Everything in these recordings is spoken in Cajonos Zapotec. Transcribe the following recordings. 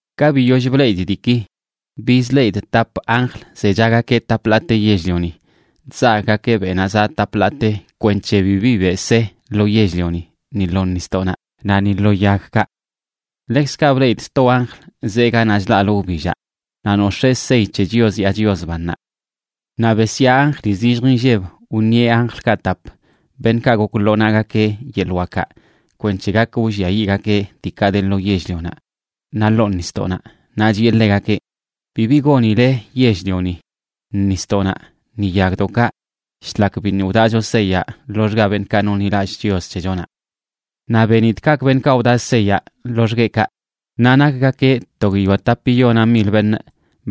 Ka biyoll bleꞌidꞌ diiki, bizleꞌidꞌ tap anjl zechagakeꞌ tap ḻaate yell-lioni, chzagꞌgakeꞌ beꞌnaꞌ zaꞌ tap ḻaate kwenc̱he bibi beꞌ se lo yell-lioni ni lo nisdoꞌnaꞌ naꞌ ni lo yagkaꞌ. Ḻekzkaꞌ bleꞌidꞌ sto anjl zee ganaꞌ chlaꞌlə wbillaꞌ, naꞌ nox̱ee sey c̱he Chios yaa Chios bannaꞌ. Naꞌ besyaa anjli zillj inlleb wṉieꞌ anjlkaꞌ tap, beṉꞌkaꞌ gok lo naꞌgakeꞌ yeḻꞌ wakaꞌ kwenc̱he gak wlliayiꞌgakeꞌ diikaꞌ de lo yell-lionaꞌ naꞌ ḻoo nisdoꞌnaꞌ, naꞌ chiꞌe ḻegakeꞌ: ―Bibi gonile yell-lioni, nisdoꞌnaꞌ, ni yagdoꞌkaꞌ shlak biṉꞌ wdaꞌcho seyaꞌ loxga beṉꞌkaꞌ nonḻilallꞌ Chios c̱hechonaꞌ. Naꞌ benidꞌ kaꞌkꞌ beṉꞌkaꞌ wdaꞌ seyaꞌ loxgueꞌkaꞌ, naꞌ nakgakeꞌ to guiyoa tapiyona mil beṉꞌ,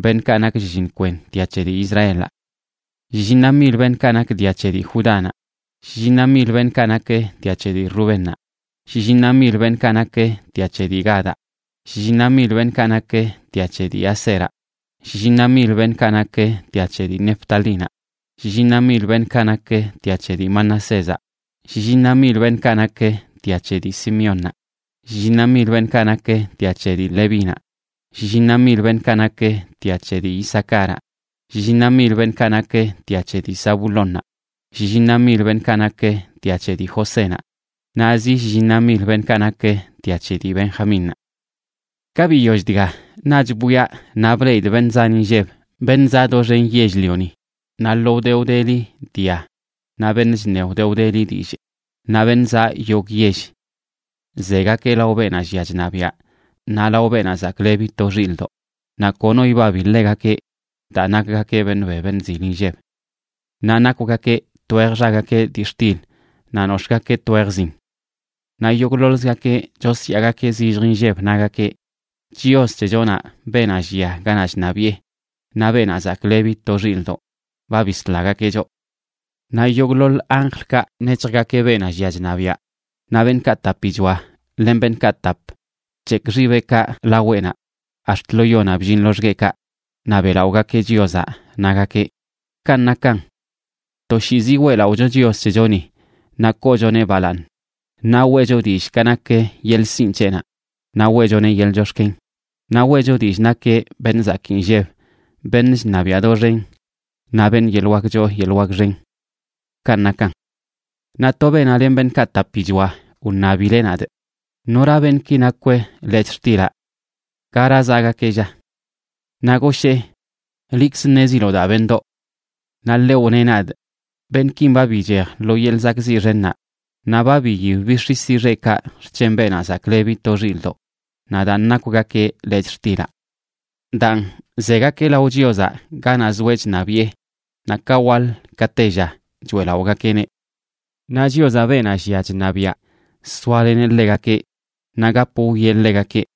beṉꞌkaꞌ nak shlliṉ kwen dia c̱he dii Israelaꞌ. Shlliṉa mil beṉꞌkaꞌ nak dia c̱he dii Judánaꞌ, shlliṉa mil beṉꞌkaꞌ nak dia c̱he dii Rubénnaꞌ, shlliṉa mil beṉꞌkaꞌ nak dia c̱he dii Gadaꞌ, shlliṉa mil beṉꞌkaꞌ nak dia c̱he dii Aseraꞌ, shlliṉa mil beṉꞌkaꞌ nak dia c̱he dii Neftalínaꞌ, shlliṉa mil beṉꞌkaꞌ nak dia c̱he dii Manasézaꞌ, shlliṉa mil beṉꞌkaꞌ nak dia c̱he dii Simeónnaꞌ, shlliṉa mil beṉꞌkaꞌ nak dia c̱he dii Levínaꞌ, shlliṉa mil beṉꞌkaꞌ nak dia c̱he dii Isacaraꞌ, shlliṉa mil beṉꞌkaꞌ nak dia c̱he dii Zabulónnaꞌ, shlliṉa mil beṉꞌkaꞌ nak dia c̱he dii Josénaꞌ, naꞌ zi shlliṉa mil beṉꞌkaꞌ nak dia c̱he dii Benjamínnaꞌ. Ka biyoll dga, naꞌch bwiaꞌ naꞌ bleꞌidꞌ beṉꞌ zan inlleb, beṉꞌ zaꞌ doxen yell-lioni, naꞌ lo wde wdeli dia, naꞌ beṉꞌ chṉe wde wdeli dillꞌ, naꞌ beṉꞌ zaꞌ yogꞌ yell. Zegakeꞌ lao beenaꞌ llia chṉabiaꞌ naꞌ lao Beenaꞌ Zaklebi to Xilꞌdoꞌ, naꞌ kono ibabi ḻegakeꞌ daa nakgakeꞌ beṉꞌ be beṉꞌ zil inlleb. Naꞌ nakwgakeꞌ twej xagakeꞌ dii xtil naꞌ nox̱ꞌgakeꞌ twej zin. Naꞌ yogꞌḻoḻzgakeꞌ chosyaagakeꞌ zillj inlleb, nagakeꞌ: Chios c̱hechonaꞌ, beenaꞌ llia ganaꞌ chṉabiꞌe, naꞌ Beenaꞌ Zaklebi to Xilꞌdoꞌ ba bislagakeꞌ choꞌ. Naꞌ yogꞌḻoḻ anjlkaꞌ nec̱hjgakeꞌ beenaꞌ llia chṉabiaꞌ, naꞌ beṉꞌkaꞌ tapichoa len beṉꞌkaꞌ tap, bc̱hekꞌ xibeꞌkaꞌ laweꞌnaꞌ ax̱t lo yonaꞌ bllin loxgueꞌkaꞌ, naꞌ beꞌlaꞌogakeꞌ Chiozaꞌ, nagakeꞌ: ¡Kanꞌ nakan! Toshiizi weꞌlaꞌocho Chios c̱hechoni, naꞌ koochoneꞌ balaaṉ, naꞌ weꞌcho dillꞌ ka nak yeḻꞌ sinꞌ c̱heꞌnaꞌ, naꞌ weꞌchoneꞌ yeḻꞌ chox̱ken, naꞌ weꞌcho dillꞌ nakeꞌ beṉꞌ zakii nlleb, beṉꞌ chṉabiaꞌ doxen, naꞌ beṉꞌ yeḻꞌ wak choo yeḻꞌ wak xen. ¡Kanꞌ nakan! Naꞌ to beenaꞌ len beṉꞌkaꞌ tapichoa wṉabileꞌ nadꞌ: ―¿Nora beṉꞌki nakw lechꞌ xtilaꞌ? ¿Gara zaꞌgakeꞌ, lla? Naꞌ goshee: ―Liꞌkz ṉeziloꞌ daa, beṉꞌdoꞌ. Naꞌ ḻeꞌ wneꞌ nadꞌ: Beṉꞌkin ba bichej lo yeḻꞌ zakꞌziꞌ xennaꞌ, naꞌ ba biyib bix̱isi xeꞌkaꞌ xc̱hen Beenaꞌ Zaklebi to Xilꞌdoꞌ, naꞌ daan nakwgakeꞌ lechꞌ xtilaꞌ. Daan, zegakeꞌ lao Chiozaꞌ ganaꞌ zoeꞌ chṉabiꞌe naꞌ ka waḻ ka tella choeꞌlaꞌogakeꞌneꞌ. Naꞌ Chiozaꞌ, beenaꞌ llia chṉabiꞌa soaleneꞌ ḻegakeꞌ naꞌ gap wwieꞌ ḻegakeꞌ.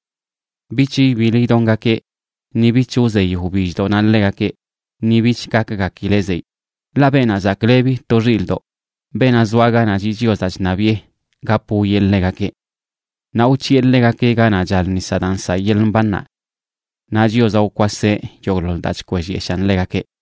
Bich ibiḻ idongakeꞌ, ni bich wzey wbilldoꞌnaꞌ ḻegakeꞌ, ni bich gakgakileꞌ zeyꞌ, ḻaꞌ Beenaꞌ Zaklebi to Xilꞌdoꞌ, beenaꞌ zoa ganaꞌ chiꞌ Chiozaꞌ chṉabiꞌe, gap wwieꞌ ḻegakeꞌ. Naꞌ wc̱hiꞌe ḻegakeꞌ ganaꞌ chal nisaꞌ daa nsaꞌ yeḻꞌ mbannaꞌ. Naꞌ Chiozaꞌ wkwaseꞌ yogꞌḻoḻ daa chkwellyeshaan ḻegakeꞌ.